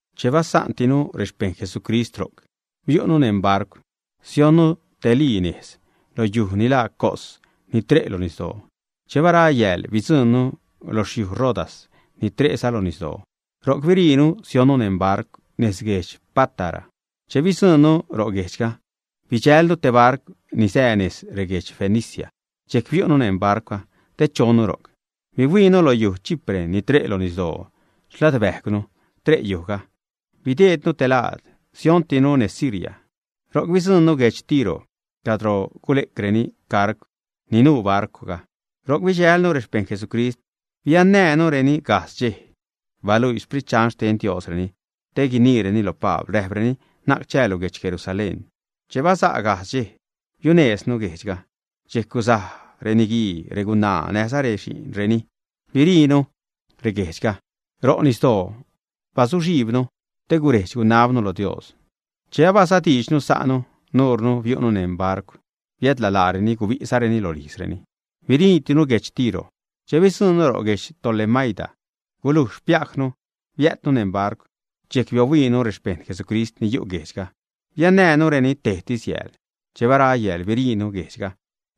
Che basa'ntinu rexpejṉ Jesucrist ro'c, biu'nu neṉ barcw, sionnu te lii nejz lo yuj ni laa Cos, ni tre' lo nisdoo. Che bara yääl, bidzuṉnu lo xyuj Rodas ni tre'za lo nisdoo. Ro'c biriinu sionnu neṉ barcw nez guedx Pátara. Che bidzuṉnu ro' guejdxga, bidxälnu te barcw ni sää nez reguedx Fenicia. Dxejc biu'nu neṉ barcwga te chonnu ro'c. Bahuiinu lo yuj Chipre ni tre' lo nisdoo, xladbäjcwnu tre' yujga, bideednu te laad. Siontinu nez Siria, ro'c bidzuṉnu guedx Tiro cadro gule'creni cargw ni nuu barcwga. Ro'c bidxälnu rexpejṉ Jesucrist. Biannänureni gajdz dxej. Baluii Sprit Dxan xten Diosreni te guniireni lo Pabl, räjpreni: ―Na'c chäälu guedx Jerusalén. Che baza' gajdz dxej, biunejznu guejdxga. Dxejc guzaj reniguii, regunaa, näjza rexi'nreni biriinu guejdxga. Ro' nisdoo bazuxhijbnu te guredx-gunabnu lo Dios. Che abazadiidxnu sa'nu, nuure biu'nu neṉ barcw, biädla laareni gubisacreni rolijzreni. Biriitinu guedx Tiro. Che bidzuṉnu ro' guedx Tolemaida, gulujx xpiajnu biäjtnu neṉ barcw. Dxejc biohuiinu rexpejṉ Jesucrist ni yu' guejdxga, biannänureni tejtis yääl. Che bara yääl, biriinu guejdxga,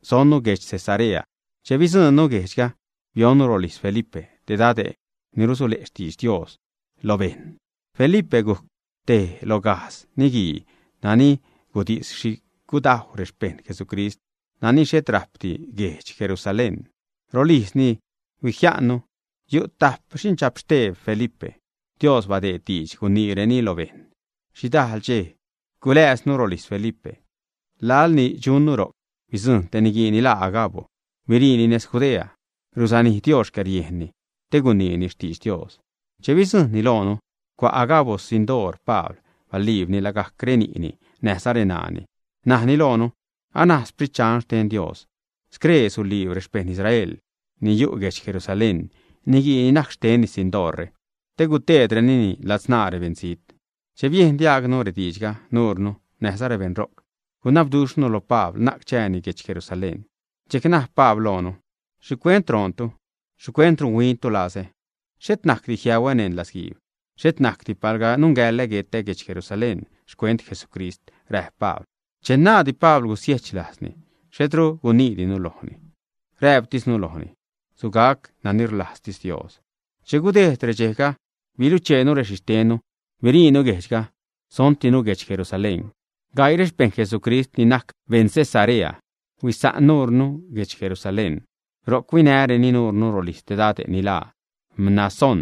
sonnu guedx Cesarea. Che bidzuṉnu guejdxga, bionnu rolijz Felipe, te dade' ni rusule' xtidx Dios lo bejṉ. Felipe gujc tej lo gajdz niguii nani gudis xhi gudajw rexpeṉ Jesucrist nani xhet rajpdi guedx Jerusalén. Rolijzni huijia'nnu. Yu' tajp xindxapxteb Felipe. Dios badeed diidx guiniireni lo bejṉ. Xhidajḻ dxej guläjznu rolijz Felipe. Laḻ ni dxunnu ro'c, bidzujṉ te niguii ni laa Agabo, biriini nez Judea. Ruzanij Dios xcäriejnni te guiniini xtidx Dios. Che bidzujṉni loonu, cua' Agabo xsindoor Pabl, baliibni lagajc reni'ni näjza reṉaani, najni loonu: ―Anaj Sprit Dxan xten Dios: “Scree suliib rexpejṉ Israel ni yu' guedx Jerusalén niguii ni najc xtenni sindoorre te guteedrenini ladzṉaa rebeṉzijt.” Che biejn diaagnu rediidxga, nuure näjza rebeṉ ro'c, gunabduxhnu lo Pabl na'c chääni guedx Jerusalén. Dxejc naj Pabl loonu: ―¿Xhicuent roontu? ¿Xhicuent runhuiintu lazä? Xhet najcdi jiäuä neṉ latzguiib, xhet najcdi palga nungäḻä guetä guedx Jerusalén xcuent Jesucrist ―räjp Pabl. Che naaddi Pabl gusiechlajzni, xhetru guniidinu lojni. Räjptisnu lojni: ―Sugac nani rlajztis Dios. Che gudejd redxejga, bilucheenu rexhixtennu, biriinu guejdxga, sontinu guedx Jerusalén. Gaii rexpejṉ Jesucrist ni najc beṉ Cesarea huisa'n nuure guedx Jerusalén. Ro'c huinäreni nuure rolijz te dade' ni laa Mnasón,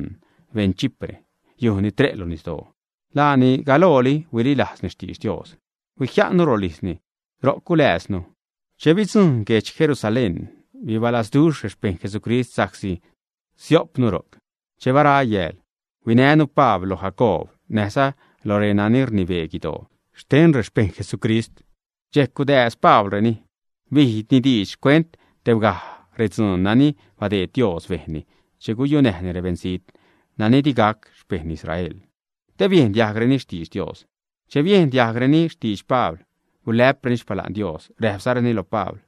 beṉ Chipre, yuj ni tre' lo nisdoo. Laani galooli huililajzni xtidx Dios. Huijia'nnu rolijzni, ro'c gulääznu. Che bidzuṉnu guedx Jerusalén, bibalazduxh rexpejṉ Jesucrist sa'csi siopnu ro'c. Che bara yääl huinänu Pabl lo Jacoob näjza lo renani rnibee guidoo xten rexpejṉ Jesucrist. Dxejc gudääz Pablreni, bijni diidx xcuent tebgaj redzuun nani badeed Dios bejnni che guyunäjni rebeṉzijt nani di gac xpejṉ Israel, te biejn diajgreni xtidx Dios. Che biejn diajgreni xtidx Pabl, gulä'preni xpala'n Dios, räjpzareni lo Pabl: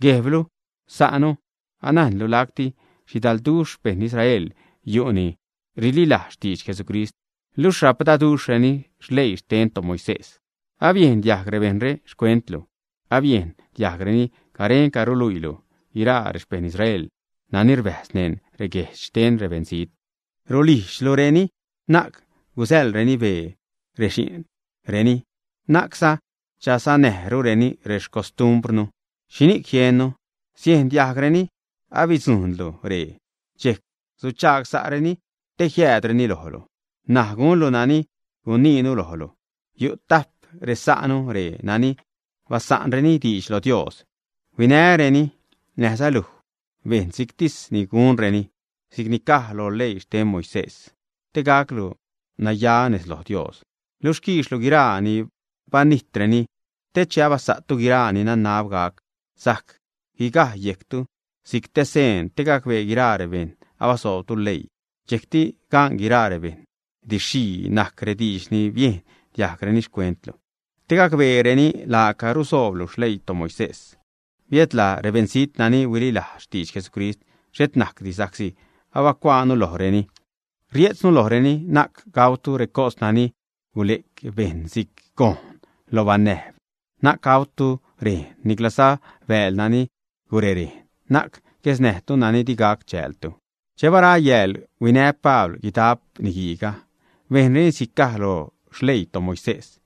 ―Guejblu, sa'nu, anajnlu lacti xhidalduxh xpejṉ Israel yu' nani rililajz xtidx Jesucrist luxh rapdaduxhreni leii xten toMoisés. Abiejn diajg rebejṉre xcuentlu. Abiejn diajgreni garenca ruluiilu guiraa rexpejṉ Israel nani rbäjz neṉ reguejdx xten rebeṉzijt, rulijdxlureni na'c gusäḻreni bee rexi'nreni, na'cza chazanäjrureni rexcostumbrnu. ¿Xhini'c jiennu? Siejn diajgreni abidzujṉlu ree, dxejc suchagsa'reni te jiäädreni lojlu. N̲aj gunlu nani guiniinu lojlu. Yu' tajp resa'nu ree nani basa'nreni diidx lo Dios. Huinäreni, näjza luj bejn si'ctis gunreni si'c ni caj lo leii xten toMoisés, te gaclu naya nez lo Dios. Luj quiixlu guiraa ni banijtreni, te che abasa'tu guiraa ni nanab gac sajc guigaj yejctu si'c te seen te gacbee guiraa rebejṉ abasoobtu leii. Dxejcti gan guiraa rebejṉ didx-xhii najc rediidx ni biejn diajgreni xcuentlu. Te gacbeereni laaca rusooblu xleii toMoisés. Biädla rebeṉzijt nani huililajz xtidx Jesucrist, xhet najcdi, sa'csi abacuaanu lojreni, rie'tznu lojreni: na'c gautu recos nani gule'c bejṉ si'c gojṉ loj banäjb, na'c gautu rejn, niclaza bääl nani gurerejn, na'c guesnäjtu nani di gac chäältu. Che bara yääl, huinä Pabl guidap niguiiga, bejnreni si'c caj lo xleii toMoisés,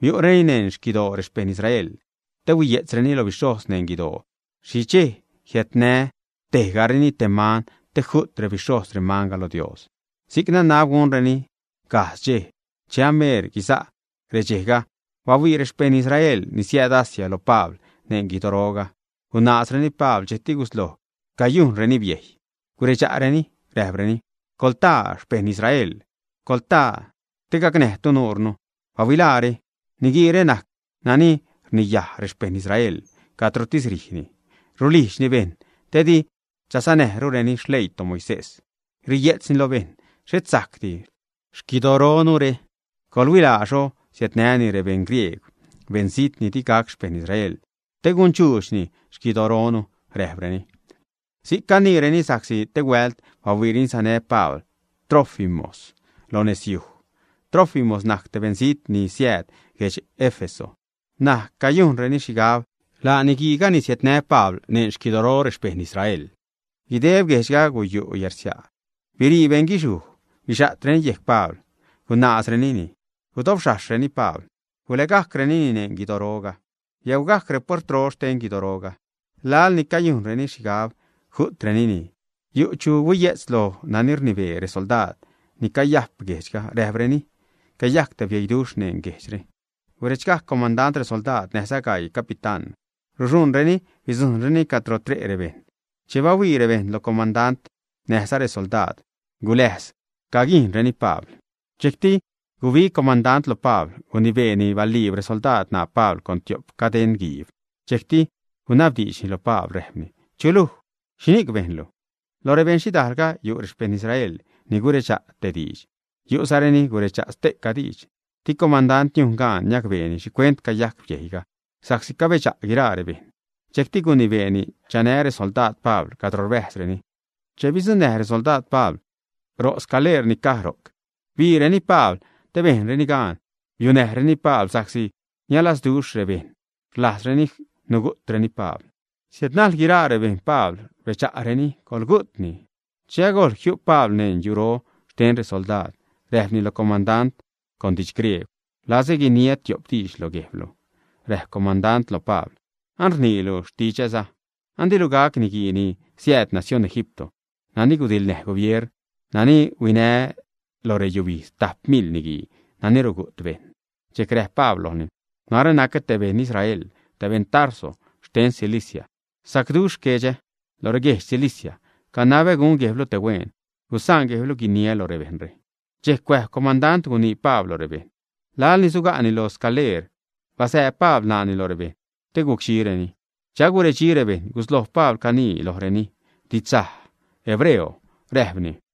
biu'reni neṉ xquidoo rexpejṉ Israel te huiye'tzreni lo bixhojz neṉ guidoo xhi dxej jiädnä tejgareni te man te ju't rebixhojz remanga lo Dios. Si'c nanab gunreni gajdz dxej. Che ameer guiza' redxejga, bahuii rexpejṉ Israel ni siääd Asia lo Pabl neṉ guidoroga. Gunaazreni Pabl, dxejcti gusloj cayujnreni biejy, guredxa'reni räjpreni: ―¡Coḻtaa xpejṉ Israel! ¡Coḻtaa te gacnäjtu nuure! ¡Bahuilaare! Niguiire najc nani rniyaj rexpejṉ Israel cadrotis rijni. Rulijdxni bejṉ te di chazanäjrureni xleii toMoisés, riye'tzni lo bejṉ xhet sajcdi xquidoronure. Coḻhuilaa xho siädnäni ree beṉ griegw, beṉzijt ni di gac xpejṉ Israel, te gundxuudxni xquidoronu ―räjpreni. Si'c caniireni sa'csi te huält bahuiireni sanä Pabl Trófimos lo nezyuj. Trófimos najc te beṉzijt ni siääd guedx Éfeso. N̲aj cayujnreni xhigab laa niguiiga ni siädnä Pabl neṉ xquidoro rexpejṉ Israel. Guideb guejdxga guyu' yärsia', bire' beṉguixhuj, bixa'treni yejc Pabl, gunaazrenini, gudobxhajxhreni Pabl, gulägajcrenini neṉ guidoroga. Biäugajc repuertro xten guidoro. Laḻ ni cayujnreni xhigab ju'trenini, yu' chu huiye'tz lo nani rnibee resoldaad ni caya'p guejdxga, räjpreni: ―Cayajc te bieiduxh neṉ guejdxre. Guredxgajc comandant resoldaad näjza gaii capitán, ruxuṉreni bidzujṉreni cadro tre' rebejṉ. Che bahuii rebejṉ lo comandant näjza resoldaad, guläjz caguijṉreni Pabl. Dxejcti gubig comandant lo Pabl, gunibeeni baliib resoldaad ṉaa Pabl con tiop cadeṉguiib. Dxejcti gunabdiidxni lo Pabl, räjpni: ―¿Chu luj? ¿Xhini'c bejnlu? Lo rebeṉ xhidaalga yu' rexpejṉ Israel ni guredxa' tej diidx, yu'za reni guredxa' ste'ca diidx. Di comandant niujn gan niacbeeni xhicuent cayajc biejy sa'csi cabedxa' guiraa rebejṉ. Dxejc gunibeeni chanä resoldaad Pabl cadro rbäjzreni. Che bidzuṉnäj resoldaad Pabl ro' scaleer ni caj ro'c, biireni Pabl te bejnreni gan biunäjreni Pabl, sa'csi nialazduxh rebejṉ rlajzreni nugu'treni Pabl. Siädnajl guiraa rebejṉ Pabl, rbedxa'reni: ―Coḻgugu'tni. Che agojḻ jiu' Pabl neṉ yuro xten resoldaad, räjpni lo comandant con diidx griegw: ―Rlazä guiniä tiop diidx lo guejblu. Räjp comandant lo Pabl: ―¡An rniilu xtidxsaä! An dilu gac niguii ni siääd nacióṉ Egipto, nani gudiḻnäj gubier, nani huinä lo reyubijdz tajp mil niguii nani rugu't bejṉ. Dxejc räjp Pabl lojni: ―Narä nacä te beṉ Israel, te beṉ Tarso xten Cilicia. Sacduxh guejdxga lo reguedx Cilicia. Canabä gun guejblu te hueen, gusaan guejblu guiniä lo rebejṉre. Dxejc cuäjb comandant guinii Pabl lo rebejṉ. Lal ni suga'ni lo scaleer basääb Pabl ṉaani lo rebejṉ te gucdxireni. Che aguredxi rebejṉ, gusloj Pabl canii lojreni didxsaj hebreo, räjpni: